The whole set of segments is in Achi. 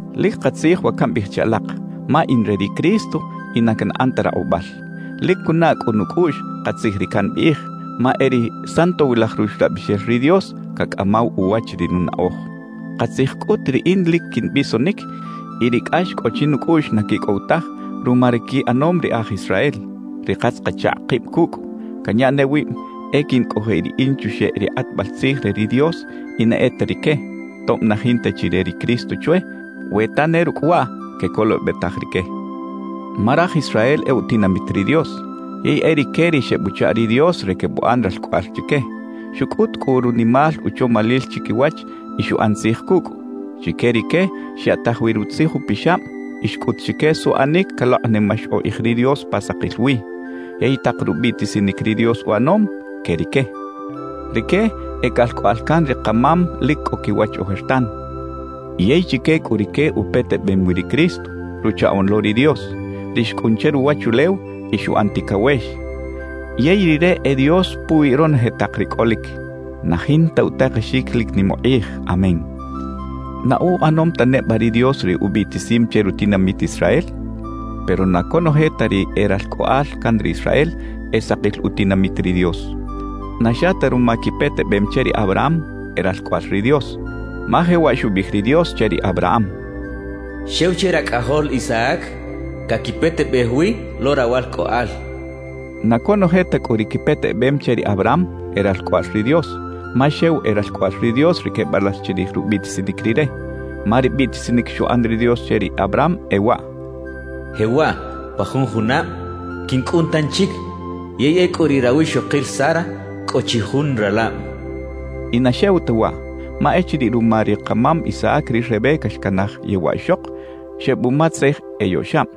Lic katzij wa cambiꞌij che alak, ma in re ri Cristo y na canꞌan ta rakꞌubal. Lic cunaꞌ cꞌu nucꞌuꞌx katzij ri cambiꞌij, ma e ri Santowilaj Ruxlabixel ri Dios cacꞌamaw uwach ri nunaꞌoj. Katzij cꞌut riꞌin lic quimbisonic y ri cꞌax cꞌo chinucꞌuꞌx na quicꞌow taj ruma ri quiꞌanom ri e aj Israel, ri katz-kachakꞌ kib cucꞌ. Canya ne wib e quincꞌojiꞌ riꞌin chuxeꞌ ri kꞌatbal tzij re ri Dios y na e ta rique, tob na jinta chi re ri Cristo chwe, we ta ne rucꞌ waꞌ quecolobetaj rique. Ma raj Israel e utinamit ri Dios, yey e rique ri xebuchaꞌ ri Dios re quebuꞌan ralcꞌoꞌal chique; xucꞌut cꞌu runimal uchomalil chiquiwach y xuꞌan tzij cucꞌ. Chique rique xyaꞌtaj wi Rutzij Upixab y xcꞌut chique suꞌanic calokꞌnimax ukꞌij ri Dios pa sakil wi. Yey tak rubiꞌtisinic ri Dios uꞌanom, que rique. Rique e calcꞌoꞌal can ri kamam lic cꞌo quiwach ojertan. Yey chique cꞌu rique upetebem wi ri Cristo, Ruchaꞌoꞌn lo ri Dios, ri xcꞌun che ruwachulew y xuꞌan ticawex. Yey Rire e Dios puwi ronoje tak ri cꞌolic. ¡Na jinta utakexic lic nim ukꞌij! ¡Amén! ¿Na uꞌanom ta neba ri Dios ri ubiꞌtisim che rutinamit Israel? Pero na conoje ta ri e ralcꞌoꞌal can ri Israel e sakil utinamit ri Dios. Na xa ta ruma quipetebem che ri Abraham, e ralcꞌoꞌal ri Dios. Ma jewaꞌ xubiꞌij ri Dios che ri Abraham: «Xew che racꞌajol Isaac caquipetebej wi lo rawalcꞌoꞌal» xchaꞌ. Na conoje ta cꞌu ri quipetebem che ri Abraham, e ralcꞌoꞌal ri Dios; ma xew e ralcꞌoꞌal ri Dios ri quebalax chirij rubiꞌtisinic Rire. Ma ri biꞌtisinic xuꞌan ri Dios che ri Abraham e waꞌ: «Jewaꞌ pa jun junab quincꞌun tanchic, yey ecꞌu riꞌ rawixokil Sara cꞌo chi jun ralab» xchaꞌ. Y na xew ta waꞌ, ma echiriꞌ ruma ri kamam Isaac ri Rebeca xcanaj yewaꞌ ixok, xebumatzej eyoꞌxab.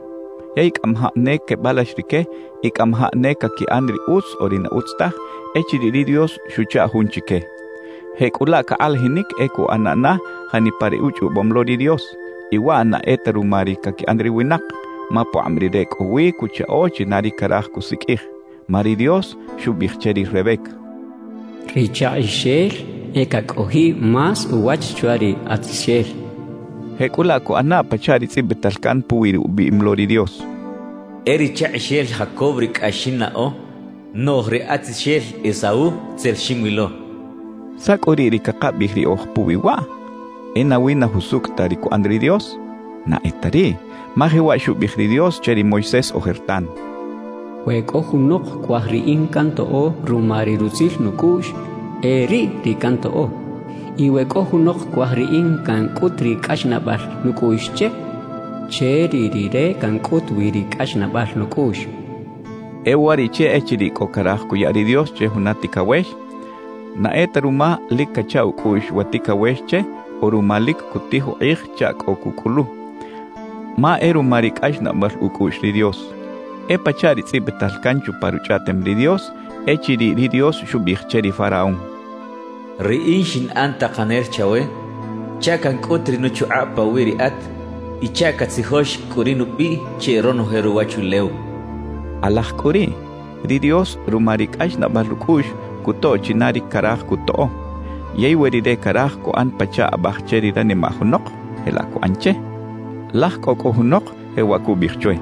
Yey cꞌamajaꞌ ne quebalax rique y cꞌamajaꞌ ne caquiꞌan ri utz o ri na utz taj echiriꞌ ri Dios xuchaꞌ jun chique. Jecꞌulaꞌ cakꞌalajinic e cuꞌana na janipa ri uchꞌobom lo ri Dios; y waꞌ na e ta ruma ri caquiꞌan ri winak, ma pukꞌab Rire cꞌo wi cuchaꞌo china ri caraj cusiqꞌuij. Ma ri Dios xubiꞌij che ri Rebeca: «Ri chakꞌixel e cacꞌojiꞌ más uwach chwa ri atzixel» xchaꞌ. Jecꞌulaꞌ cuꞌana pachaꞌ ri tzꞌibital can puwi ri ubiꞌim lo ri Dios: E ri chakꞌixel Jacob ri cꞌax xinnaꞌo; noꞌj ri atzixel Esaú, tzel xinwilo xchaꞌ. ¿Saꞌ cꞌu riꞌ ri cakabiꞌij riꞌoj puwi waꞌ? ¿E nawi na jusucꞌ ta ri cuꞌan ri Dios? ¡Na e ta riꞌ! Ma jewaꞌ xubiꞌij ri Dios che ri Moisés ojertan: We cꞌo junok cuaj Riꞌin cantoꞌo ruma ri rutzil nucꞌuꞌx, e riꞌ ri cantoꞌo. Y we cꞌo junok cuaj Riꞌin cancꞌut ri cꞌaxnaꞌbal nucꞌuꞌx che, che riꞌ rire cancꞌut wi ri cꞌaxnaꞌbal nucꞌuꞌx xchaꞌ. E uwariꞌche echiriꞌ cꞌo caraj cuya ri Dios che juna ticawex, na e ta ruma lic cacha ucꞌuꞌx wa ticawex che o ruma lic cutij ukꞌij chaꞌ cꞌo cucꞌulu; ma e ruma ri cꞌaxnaꞌbal ucꞌuꞌx ri Dios. E pachaꞌ ri tzꞌibital can chupa Ruchꞌaꞌtem ri Dios echiriꞌ ri Dios xubiꞌij che ri faraón: «Riꞌin xinꞌan takanel chawe chaꞌ cancꞌut ri nuchukꞌab pawiꞌ riꞌat y chaꞌ catzijox cꞌu ri nubiꞌ che ronoje ruwachulew» xchaꞌ. Kꞌalaj cꞌu riꞌ ri Dios ruma ri cꞌaxnaꞌbal ucꞌuꞌx cutoꞌ china ri caraj cutoꞌo. Yey we Rire caraj cuꞌan pachaꞌ abaj che ri ranimaꞌ junok, jelaꞌ cuꞌan che. Laj cꞌo cꞌu junok jewaꞌ cubiꞌij chwe: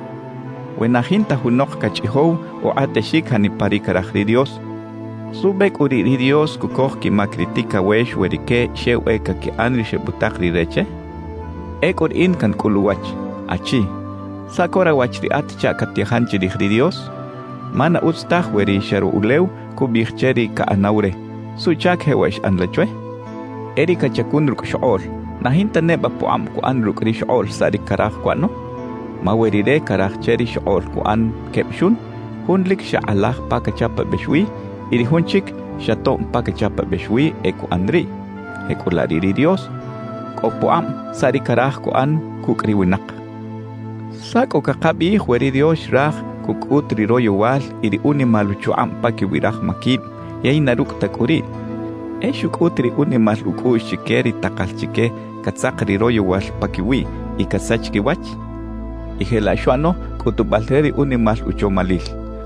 «We na jinta junok cachꞌijow ukꞌatexic janipa ri caraj ri Dios, ¿suꞌbe cꞌu riꞌ ri Dios cucoj quimac ri ticawex we rique xew e caquiꞌan ri xebutak Rire che?» Ecꞌu riꞌin cancꞌul uwach: «Achi, ¿saꞌ co rawach riꞌat chaꞌ catyajan chirij ri Dios? Ma na utz taj we ri xaro ulew cubiꞌij che ri caꞌanaw re: ¿Suꞌchac jewaꞌ xꞌan la chwe?» E ri cachacun rucꞌ xokꞌoꞌl, ¿na jinta neba pukꞌab cuꞌan rucꞌ ri xokꞌoꞌl saꞌ ri caraj cuꞌano? Ma we Rire caraj che ri xokꞌoꞌl cuꞌan queb xun, jun lic xa kꞌalaj pa cachapabex wi y ri jun chic xa tob pa cachapabex wi, e cuꞌan riꞌ. Jecꞌulaꞌ riꞌ ri Dios cꞌo pukꞌab saꞌ ri caraj cuꞌan cucꞌ ri winak. ¿Saꞌ cꞌu cakabiꞌij we ri Dios xraj cucꞌut ri royowal y ri unimal uchukꞌab paquiwi raj maquib yey na rucꞌ ta cꞌu riꞌ, e xucꞌut ri unimal ucꞌuꞌx chique ri takal chique catzak ri royowal paquiwiꞌ y casach quiwach? Y jelaꞌ xuꞌano cꞌutubal re ri unimal uchomalil.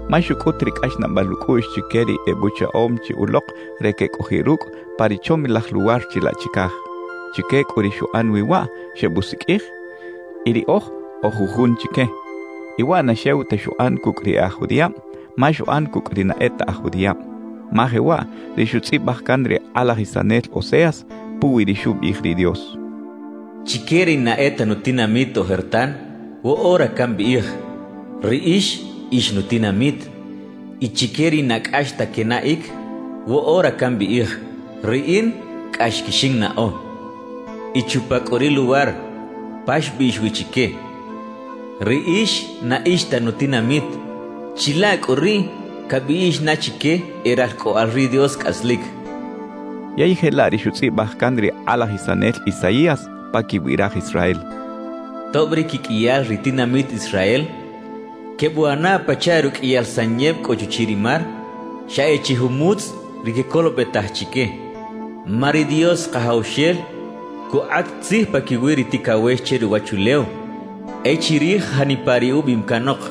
Ma xucꞌut ri cꞌaxnaꞌbal ucꞌuꞌx chique ri ebuchaꞌom chi ulok re quecꞌojiꞌ rucꞌ pa ri chomilaj luwar chilaꞌ chicaj. Chique cꞌu ri xuꞌan wi waꞌ, xebusiqꞌuij; y riꞌoj oj jujun chique. Y waꞌ na xew ta xuꞌan cucꞌ ri e aj judiꞌab, ma xuꞌan cucꞌ ri na e ta aj judiꞌab. Ma jewaꞌ ri xutzꞌibaj can ri kꞌalajisanel Oseas puwi ri xubiꞌij ri Dios: Chique ri na e ta nutinamit ojertan, woꞌora cambiꞌij: «Riꞌix, ix nutinamit.» Y chique ri na cꞌax ta quenaꞌic, woꞌora cambiꞌij: «Riꞌin cꞌax quixinnaꞌo.» Y chupa cꞌu ri luwar pa xbiꞌx wi chique: «Riꞌix na ix ta nutinamit,» chilaꞌ cꞌu riꞌ cabiꞌx na chique e ralcꞌoꞌal ri Dios cꞌaslic. Yey jelaꞌ ri xutzꞌibaj can ri kꞌalajisanel Isaías paquiwi raj Israel: Tob ri quiqꞌuiyal ri tinamit Israel quebuꞌana pachaꞌ ruqꞌuiyal sanyeb cꞌo chuchiꞌ ri mar, xa e chi jumutz ri quecolobetaj chique. Ma ri Dios Kajawxel cukꞌat tzij paquiwi ri ticawex che ruwachulew e chirij janipa ri ubiꞌim canok,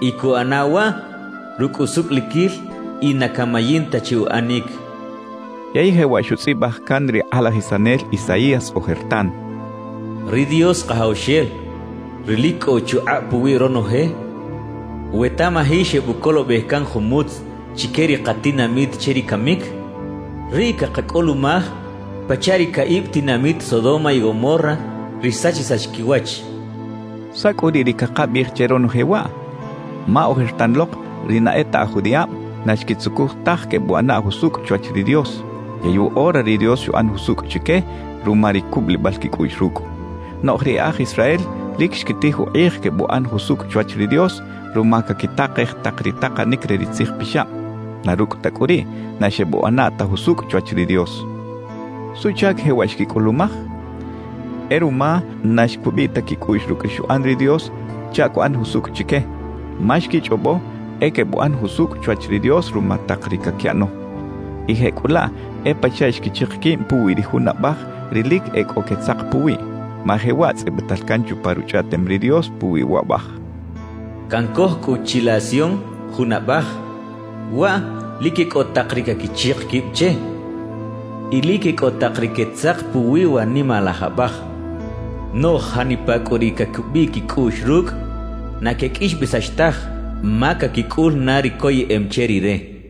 y cuꞌana waꞌ rucꞌ usucꞌliquil y na camayin ta che uꞌanic xchaꞌ. Yey jewaꞌ xutzꞌibaj can ri kꞌalajisanel Isaías ojertan: Ri Dios Kajawxel, ri lic cꞌo uchukꞌab puwi ronoje, we tamaji xebucolobej can jumutz chique ri katinamit che ri camic, riꞌ cakacꞌulumaj pachaꞌ ri caꞌib tinamit Sodoma y Gomorra, ri xsachisax quiwach xchaꞌ. ¿Saꞌ cꞌu riꞌ ri cakabiꞌij che ronoje waꞌ? Ma ojertan lok ri na e ta aj judiꞌab na xquitzucuj taj quebuꞌana jusucꞌ chwach ri Dios; yey woꞌora ri Dios xuꞌan jusucꞌ chique ruma ri cubulibal quicꞌuꞌx rucꞌ. Noꞌj ri e aj Israel lic xquitij ukꞌij quebuꞌan jusucꞌ chwach ri Dios ruma caquitakej tak ri takanic re ri Tzij Pixab; na rucꞌ ta cꞌu riꞌ, na xebuꞌana ta jusucꞌ chwach ri Dios. ¿Suꞌchac jewaꞌ xquicꞌulumaj? E ruma na xcubiꞌ ta quicꞌuꞌx rucꞌ ri xuꞌan ri Dios chaꞌ cuꞌan jusucꞌ chique. Ma xquichꞌobo e quebuꞌan jusucꞌ chwach ri Dios ruma tak ri caquiꞌano. Y jecꞌulaꞌ e pachaꞌ xquichik quib puwi ri jun Abaj ri lic e cꞌo quetzak puwiꞌ. Ma jewaꞌ tzꞌibital can chupa Ruchꞌaꞌtem ri Dios puwi wa Abaj: Cancoj cꞌu chilaꞌ Sion jun Abaj. Waꞌ lic e cꞌo tak ri caquichik quib che; y lic e cꞌo tak ri quetzak puwi wa nimalaj Abaj. Noꞌj janipa cꞌu ri cacubiꞌ quicꞌuꞌx rucꞌ, na queqꞌuixbesax taj ma caquicꞌul na ri coyeꞌem che Rire cachaꞌ.